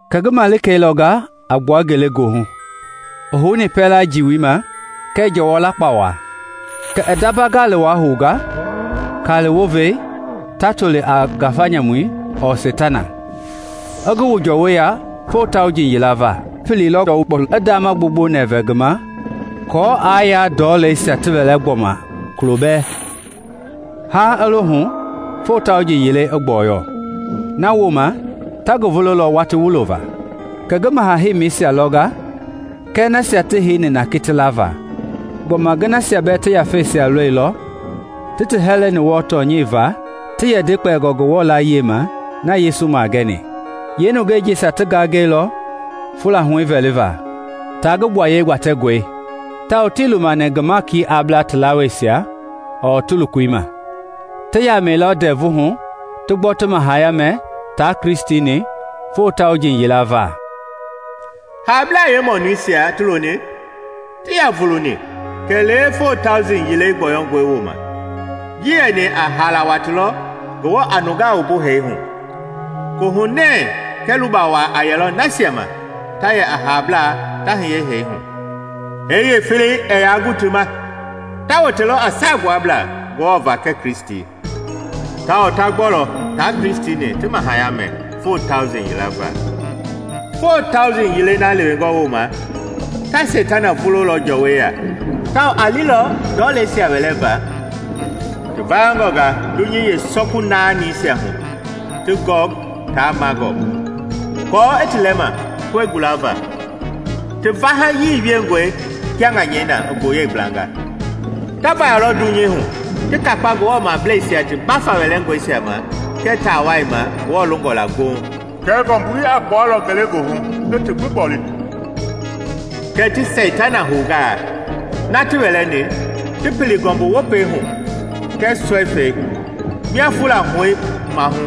Kɛ ngi malikei lɔnga a gbua ngelegoohu, i houni ndɔu lama jii ma kɛɛ jɔwɔ lakpawa. Kɛ i ndamba gali wai hounga, kali wova wai ta toli a ngafa nyamui ɔɔ seitana, i ngi wu jɔwɔi ya foo tauji yila va. I pililɔ ndɔu, i kpɔu, ti ndama gbongbo nɛvɛ ngi ma kɔɔ aa yaa ndɔleisia ti wɛlɛ gbɔma kulo bɛɛ, haaŋ i lo hu foo tauji yilei i gbɔyɔ. Nawooma ta ngi vulolɔ watii wulo va. Kɛ ngi maha heimeisia lɔnga kɛɛ nasia ti heini na kiti lava. Gbɔma ngi nasia bɛɛ ti yafeisia lɔilɔ ti ti hɛlɛni wɔɔ tɔnyɛi va ti yɛ nde kpɛlingɔ Ngewɔ layie ma na Yesu magɛni. Yeenungɛi jisia ti gangɛilɔ fula huɛi vɛli va taa ngi gbuaye gbatɛngɔi, tawao tii lumani ngi maiki a bla ti lawaasia ɔɔ ti lokoi ma. Ti yamɛilɔ ndɛvu hu ti gbɔ ti mahaya mɛ taa Kristi-ni foo tauji yila va. (Haablaa yeemɔnuisia ti loni tii yaa vuluni kɛlee foo tauji yilei gbɔyɔngɔi wooma.) Ji yɛni a haala watii lɔ Ngewɔ a nungaa wumbu hee hu. Koohunɛɛ kɛɛ luba waa a yɛlɔ nasia ma ta yɛ a haalablaa ta hiye hee hu. Hee yeefelei ɛɛ yaa gu ti ma; ta wote lɔ a saagbuablaa Ngewɔ va kɛɛ Kristi, tawao ta gbɔlɔ taa Kristi-ni ti mahaya mɛ foo tauji yila va. Foo tauji yilei na lewengɔ wooma, ta Seitana vulolɔ jɔwɔi ya, tawao a lilɔ ndɔleisia wɛlɛma ti vayangɔnga dunyei yeesɔku naanisia hu ti Gɔg taa Magɔg, aako i ti lɛma koe gulava; ti vahayii wiengɔi kia ŋanyɛi na i gboyei gblanga. Ta vayalɔ dunyei hu ti kakpa Ngewɔ mableisia ti mbafa wɛlɛngɔisia ma kɛɛ taawai ma Ngewɔ longɔ la gboŋ. Kɛɛ ngɔmbui a gbualɔ ngelegoohu i ti gbi gboli. Kɛ ti Seitana hounga, na ti wɛlɛni, ti pili ngɔmbu wopei hu kɛɛ sɔifɛi mia fula huɛi maahu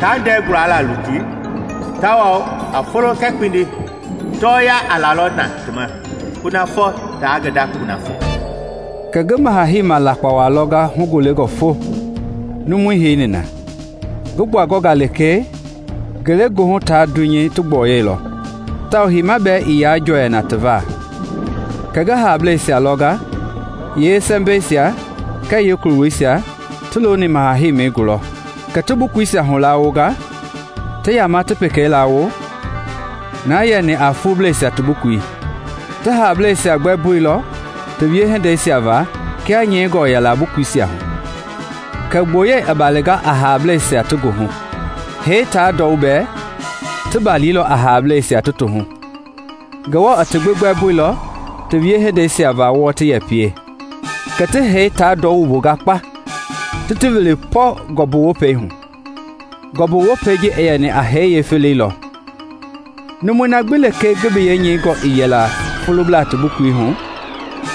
taa ndɛɛ guala lutui; tawao a folo kɛɛ kpindi tɔɔya a lalɔ na ti ma kunafɔ ta ngi nda kunafɔ Kɛ ngi maha-heima lakpawa lɔnga hugolengɔ fo numui heini na. Ngi gbuangɔnga lekee, ngelegoohu taa dunyei ti gbɔyɔilɔ tawao heima bɛɛ ii yaa jɔɛina ti va. Kɛ ngi haableisia lɔnga, yeesɛmbɛisia kɛɛ yeekulowuisia ti looni maha heimi gulɔ. Kɛ ti bukuisia hulawonga, ti yamaa ti pekei lawo, na yɛni a fuubleisia ti bukui. Ti haableisia gbɛmboilɔ ti wiehindeisia va kia nyɛingɔ yɛla bukuisia hu. Kɛ gboyei i balinga a haableisia ti ngi hu. Hee taa ndɔu bɛɛ ti balilɔ a haableisia ti ti hu. Ngewɔ i ti gbi gbɛmboilɔ ti wiehindeisia va wɔɔ ti yɛ pie. Kɛ ti hee taa ndɔu wumbunga kpa ti ti wili pɔ ngɔmbu wopei hu. (Ngɔmbu wopawai ji yɛni a hee yeefelei lɔ.) Numui na gbi lekee ngi biyei nyɛingɔ ii yɛla fuublaa ti bukui hu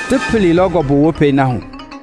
ti pililɔ ngɔmbu wopei na hu.